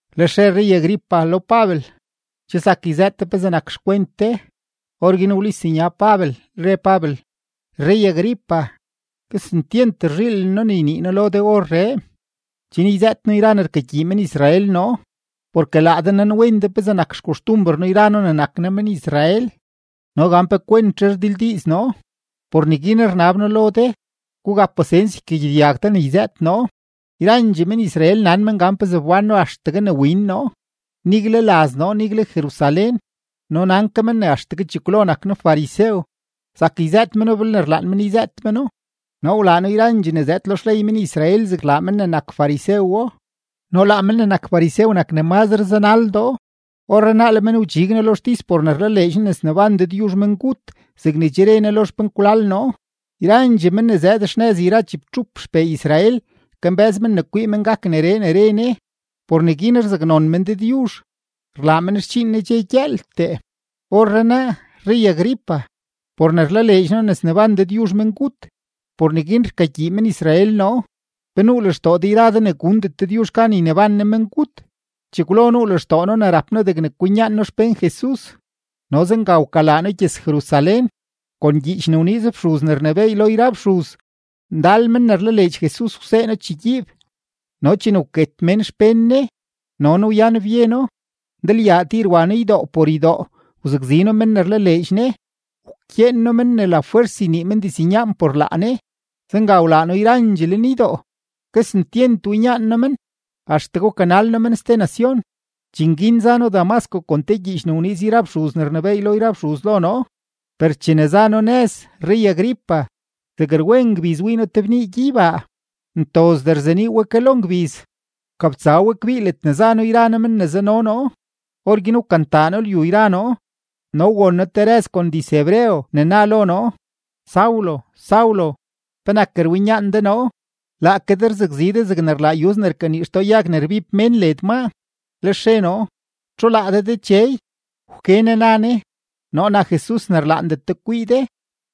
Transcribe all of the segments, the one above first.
Lex re rrey-Agripa lo Pabel: ―Che zak yzëët de pezee nak xkwent de. Orguin wlis nya Pabel, re Pabel: ―Rrey-Agripa, kesentyent rzhiilen noo ne ynii noo lo de orree, chen yzëët noo yra ne rkagyii men-Israel noo. Porke laa de nanwen de pezee nak yra xkoxtumber noo yra noo ne nak noo men-Israel no gan pe kwentzhe rdildiiz noo. Por neguin rnab noo lo de, gugap pasens ykagyedyag de ne yzëët noo. ’Yrandxee men-Israel nan men gan pezee wbán noo axtegue ne win noo, nigle laz noo, nigle Jerusalén. No nan ke men ne axtegue chekwlo nak noo farisew; zak yzëët meno belne rlaan men yzëët meno. Noo wlaa noo yrandxee ne zëëd lo xley men-Israel zegne rlaa men ne nak farisewo, no laa men ne nak farisew nak ne mazre zanaldoo. Orrenaa le men wdxig noo lo xtis por ne rlaleedx noo ne sneban Dëdyuzh mengut zegne che re Ne lo xpenkwlal noo. Yrandxee men ne zëëd xnëz yra chibtxup xpee Israel kambë́z men ne kwii men gak neree ne re Ne; por neguin rzaknon men Dëdyuzh, rlaa men xdxiin Ne dxe gyëëltee. Orrenaa, rrey-Agripa, por ne rlaleedx noo ne sneban Dëdyuzh mengut, por neguin rkagyii men-Israel noo. ¿Pe nuu lextoo de yra de ne gundet Dëdyuzh gan yneban Ne mengut? ’Chekwlo nuu lextoo noo ne rap noo degne kwinyaan noo xpén Jesus, no zenga wkalaa noo gyëz-Jerusalén. Kon gyiich ne wniiz yra fxuz ne rnebééy lo yra fxuz, ndal mén ne rlaleedx Jesus wsee noo chegyiib. No chene wket mén xpén Ne, no noo wyan byeno. Ndalyaa tir wa noo ydoo por ydoo wzakzi noo men ne rlaleedx Ne, wkyeen noo men lafwers ynii men diznyaan por laa Ne. Zenga wlaa noo yrandxee lenydoo. Kesentyent winyaan noo men, axtegue wkanal noo men ste nacion. ’Dxiin guin za noo Damasco kon te gyiich ne wniiz yra fxuz ne rnebééy lo yra fxuz lo noo. Per chene za noo nëz, rrey-Agripa, zeg rwen ngbiz wii noo te bnii gyeybaa, ntozdee rzenii we ke lo ngbiz; wkabtsa we kbii ledne za noo yra noo men ne zano noo. Orguin wkantaa noo lyu yra noo, no won noo te rëz kon diz-hebreo ne na lo noo: “Saulo, Saulo, ¿penak rwinyaan de noo? Laake de rzakzi de zegne rlaa yuz ne rkanii xtoo yag ne rbib mén led maa.” Lex re noo: “¿Txu laa de Dechey?” Wke Ne, na Ne: “Noo nak Jesus ne rlaandet de kwii de.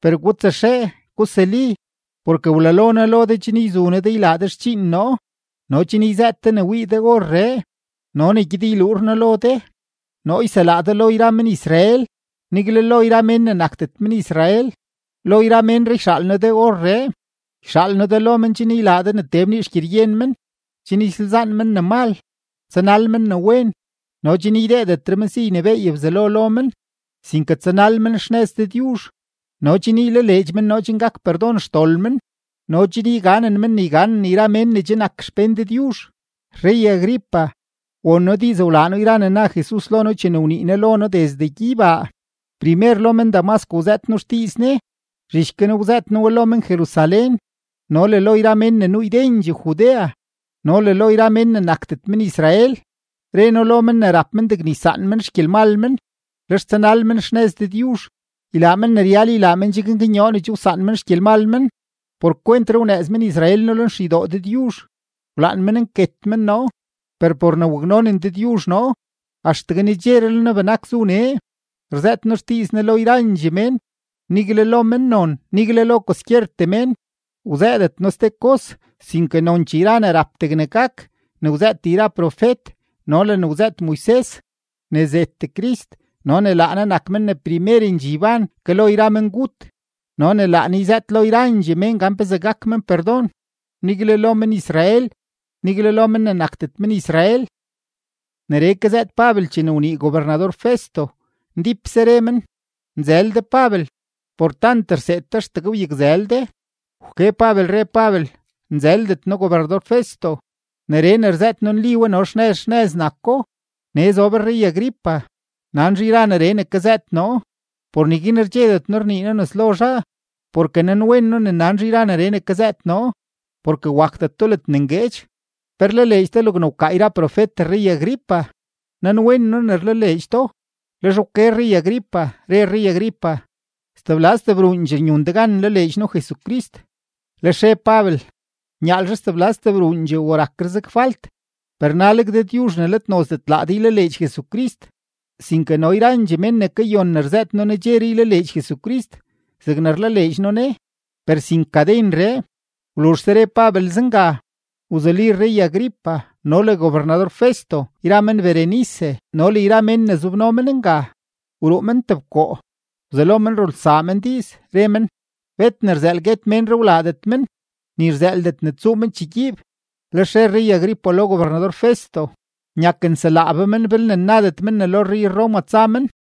Per gutsaxee, gusuli, porke wlalo noo lo de chen yzu noo de ylaa de xdxiin noo no chen yzëët de ne wii de orree no le ne gyed yluur noo lo de. Noo yselaa de lo yra men-Israel, nigle lo yra mén ne nakdet men-Israel. Lo yra ménree yxaal noo de orree. Yxaal noo de lo men chen ylaa de ne tee bnii xgyeryen men, chen ysalzaan men ne mal, tsanal men ne wen, no chen ydeedetre men si ynebééy Bzelo lo men, sinke tsanal men xnëz Dëdyuzh, no chen ylaleedx men noo chen gak perdon xdol men no chen yganen men ne yganen yra mén ne che nak xpén Dëdyuzh.” ’Rrey-Agripa, won noo diiz wlaa noo yra ne na Jesus lo noo chene wnii Ne lo noo desde gyeybaa. Primer lo men-Damasco wzëët noo xdiiz Ne, zhich guin wzëët noo we lo men-Jerusalén no le lo yra mén ne nuu ydendxee Judea no le lo yra mén ne nakdet men-Israel. Re noo lo men ne rap men degne ysaan men xgyelmal men, lex tsanal men xnëz Dëdyuzh, ylaa men ne ryal ylaa men chen gaknyoo ne che wsaan men xgyelmal men. Por kwentree wnëëz men-Israel noo lenxeydoo Dëdyuzh, wlaan men nket men noo. Per por ne waknonen Dëdyuzh noo, axtegue nedxeree le noo benak zu nee rzëët noo xdiiz Ne lo yrandxee mén, nigle lo mennon, nigle lo kwaskyertee mén. Wzëëdet noo ste kos sinke nonchee yra ne rap degne gak ne wzëët yra profet no le ne wzëët Moises: ne zet Crist no ne laa Ne nak men ne primerendxee yban ke lo yra mengut no ne laa Ne yzëët lo yrandxee mén gan pezee gak men perdon, nigle lo men-Israel, nigle lo mén ne nakdet men-Israel. Neree kazëët Pabel chene wnii gobernador-Festo, ndípse re men: ―¡Nzël de Pabel! Por tant rseed de axtegue wyakzël de. Per wke Pabel, re Pabel: ―Nzëldet noo gobernador-Festo; neree ne rzëët noo, nli we no xnëz xnëz nako. Nee zob rrey-Agripa, nan zhaa yra neree ne kazëët noo; por neguin rdxedet noo rnii noo nes lo zhaa, porke nanwen noo ne nan zhaa yra neree ne kazëët noo, porke wakdeto ledne ngueedx. ¿Pe rlaleedx de logne wkaa yra profet rrey-Agripa? Nanwen noo ne rlaleedx do. Lex wke rrey-Agripa, re rrey-Agripa: ―Stebla stebruundxee nyun de gan nlaleedx noo Jesucrist. Lex re Pabel: ―Nyaalzhe stebla stebruundxee o rakre zeg falt, per naleg Dëdyuzh ne let nozdet laa de ylaleedx Jesucrist, sinke no yrandxee mén ne kayon ne rzëët noo nedxeree ylaleedx Jesucrist zegne rlaleedx noo Ne, per sin kadenree. Wluzhse re Pabel zenga, wzuli rrey-Agripa no le gobernador-Festo yra men Berenice no le yra mén ne zobno men nga, wruu men tebkoo; wzelo men rulsaa men diiz, re men: ―Bet ne rzëël guet ménree wlaadet men, ni rzëëldet ne tsuu men chegyiib. Lex re rrey-Agripa lo gobernador-Festo: ―Nyak nselaa be men belne nnabdet men ne lo rrey-Roma tsa men.